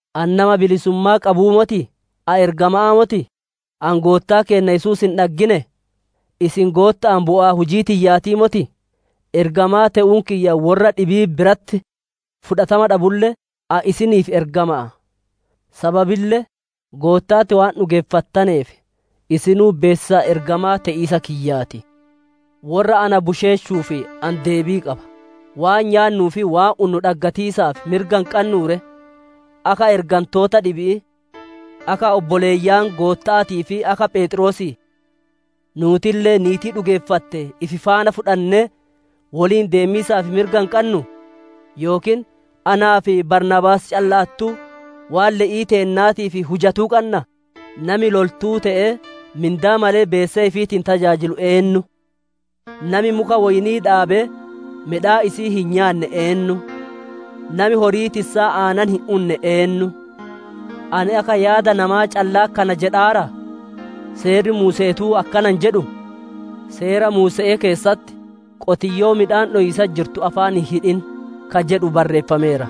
Ani nama bilisummaa qabuu motii? Ani ergama'aa motii? Ani Goottaa keenna Yesuus hin dhagginee? Isin Gootta'aan bu'aa hujii tiyyaatii motii? Ergamaa te'uun kiyya worra dhibii biratti fudhatama dhabulle, ani isiniif ergama'a. Sababille, Gootta'atti waan dhugeeffattaneef isinuu beessisa ergamaa te'iisa kiyyaa ti. Worra na busheeshuuf ani deebii qaba: waan nyaannuu fi waan unnu dhaggatiisaaf mirga hin qannuu ree? Akka Ergantoota dhibi'ii, akka obboleeyyan Gootta'aatii fi akka Pheexroosii, nuutille niitii dhugeeffatte ifi faana fudhannee woliin deemiisaaf mirga hin qannuu? Yookiin anaa fi Baarnaabaas calla'attuu waan le'ii teennaatiif hujatuu qannaa? Nami loltuu te'ee mindaa malee beesee ifiitiin tajaajilu eennu? Nami muka woyni'ii dhaabee midhaan isi'ii hin nyaanne eennu? Nami horii tissaa aanan hin unne eennu? Ani akka yaada namaa callaa kana jedhaaraa? Seerri Muuse'eetuu akkana hin jedhuu? Seera Muuse'ee keessatti, «Qotiyyoo midhaan dhowiisatti jirtu afaan hin hidhin» ka jedhu barreeffameera.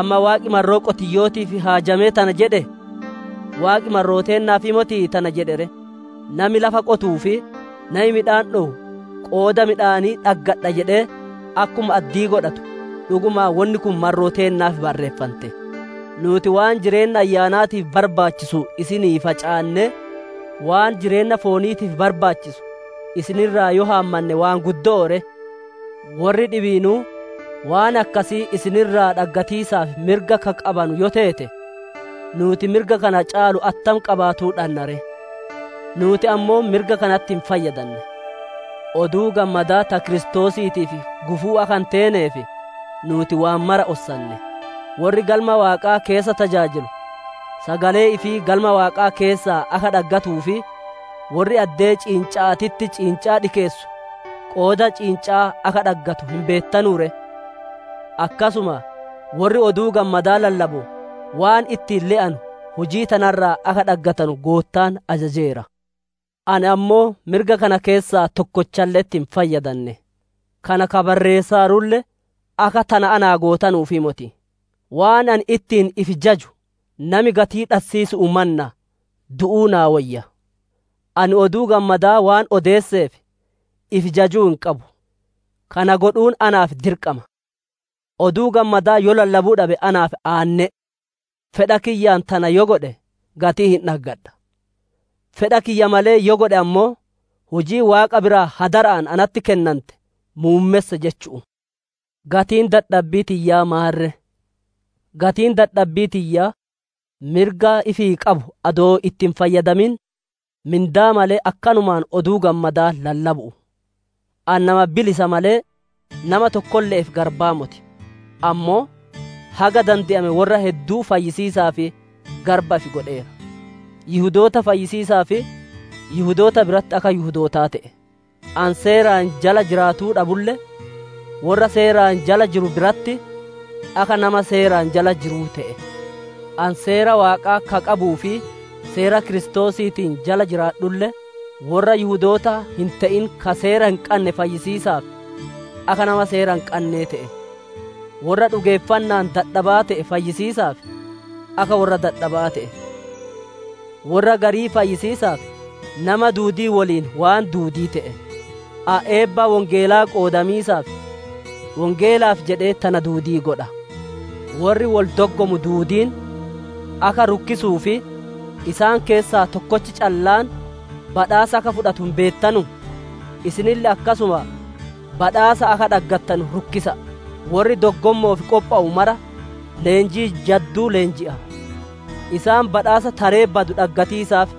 Amma Waaqi marroo qotiyyo'ootiif haajamee tana jedhee? Waaqi marroo teennaafii motii tana jedhe ree? Nami lafa qotuu fi nami midhaan dhowu qooda midhaanii dhaggadha jedhee akkuma addii godhatu, dhugumaan wonni kun marroo teennaaf barreeffante. Nuuti waan jireenna ayyaanaatiif barbaachisu isinii facaannee, waan jireenna fooniitiif barbaachisu isin irraa yoo haammanne waan guddo'oo ree? Worri dhibiinuu waan akkasii isin irraa dhaggatiisaaf mirga ka qabanu yoo teete, nuuti mirga kana caalu attam qabaatuu dhanna ree? Nuuti ammoo mirga kanatti hin fayyadanne. Oduu Gammadaa ta Kiristoosiitiif gufuu akka hin teeneef, nuuti waan mara ossanne. Worri Galma Waaqaa keessa tajaajilu sagalee ifii Galma Waaqaa keessaa akka dhaggatuu fi worri addee ciinca'aatitti ciincaa dhikeessu qooda ciinca'aa akka dhaggatu hin beettanuu ree? Akkasuma worri Oduu Gammadaa lallabu waan ittiin le'anu hujii tana irraa akka dhaggatanu Goottaan ajajeera. Ani ammoo mirga kana keessaa tokkolle'etti hin fayyadanne; kana ka barreessaarulle akka tana naa gootanuufii moti. Waan ani ittiin ifi jaju nami gatii dhassiisu'uu mannaa du'u naa woyya. Ani Oduu Gammadaa waan odeesseef ifi jajuu hin qabu. Kana godhuun naaf dirqama; Oduu Gammadaa yoo lallabuu dhabe naaf aanne'e! Fedha kiyyaan tana yoo godhe, gatii hin dhaggadha; fedha kiyya malee yoo godhe ammoo, hujii Waaqa biraa hadara'aan natti kennante muummesse jechu'u. Gatiin dadhabbii tiyyaa maan ree? Gatiin dadhabbii tiyyaa mirga ifii qabu adoo itti hin fayyadamin, mindaa malee akkanumaan Oduu Gammadaa lallabu'u. Ani nama bilisa malee, nama tokkolle'eef garbaa moti; ammoo haga dande'ame worra hedduu fayyisiisaaf garba ifi godheera. Yihudoota fayyisiisaaf Yihudoota biratti akka Yihudootaa te'e. Ani seeraan jala jiraatuu dhabulle, worra seeraan jala jiru biratti akka nama seeraan jala jiruu te'e. Ani Seera Waaqaa ka qabuu fi Seera Kiristoosiitiin jala jiraadhulle, worra Yihudoota hin te'in ka seera hin qanne fayyisiisaaf akka nama seera hin qannee te'e. Worra dhugeeffanna'aan dadhabaa te'e fayyisiisaaf, akka worra dadhaba'aa te'e. Worra garii fayyisiisaaf nama duudii woliin waan duudii te'e. Ani eebba Wongeelaa qoodamiisaaf, Wongeelaaf jedhee tana duudii godha. Worri wol doggomu duudiin akka rukkisuu fi isaan keessaa tokkochi callaan badhaasa akka fudhatu hin beettanuu? Isinille akkasuma badhaasa akka dhaggattanu rukkisa'a. Worri doggommo'oof qophowu mara leenjii jadduu leenji'a. Isaan badhaasa taree badu dhaggatiisaaf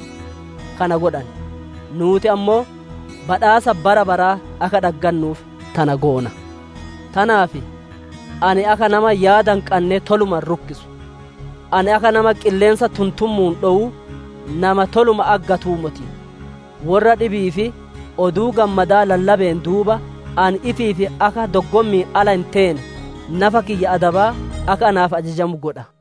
kana godhan; nuuti ammoo badhaasa bara baraa akka dhaggannuuf tana goona. Tanaaf ani akka nama yaada hin qannee toluma hin rukkisu; ani akka nama qilleensa tuntummu'uun dhowuu nama toluma aggatuu moti. Worra dhibi'iif Oduu Gammadaa lallabeen duuba, ani ifiif akka doggommi'iin ala hin teene, nafa kiyya adabaa akka naaf ajajamu godha.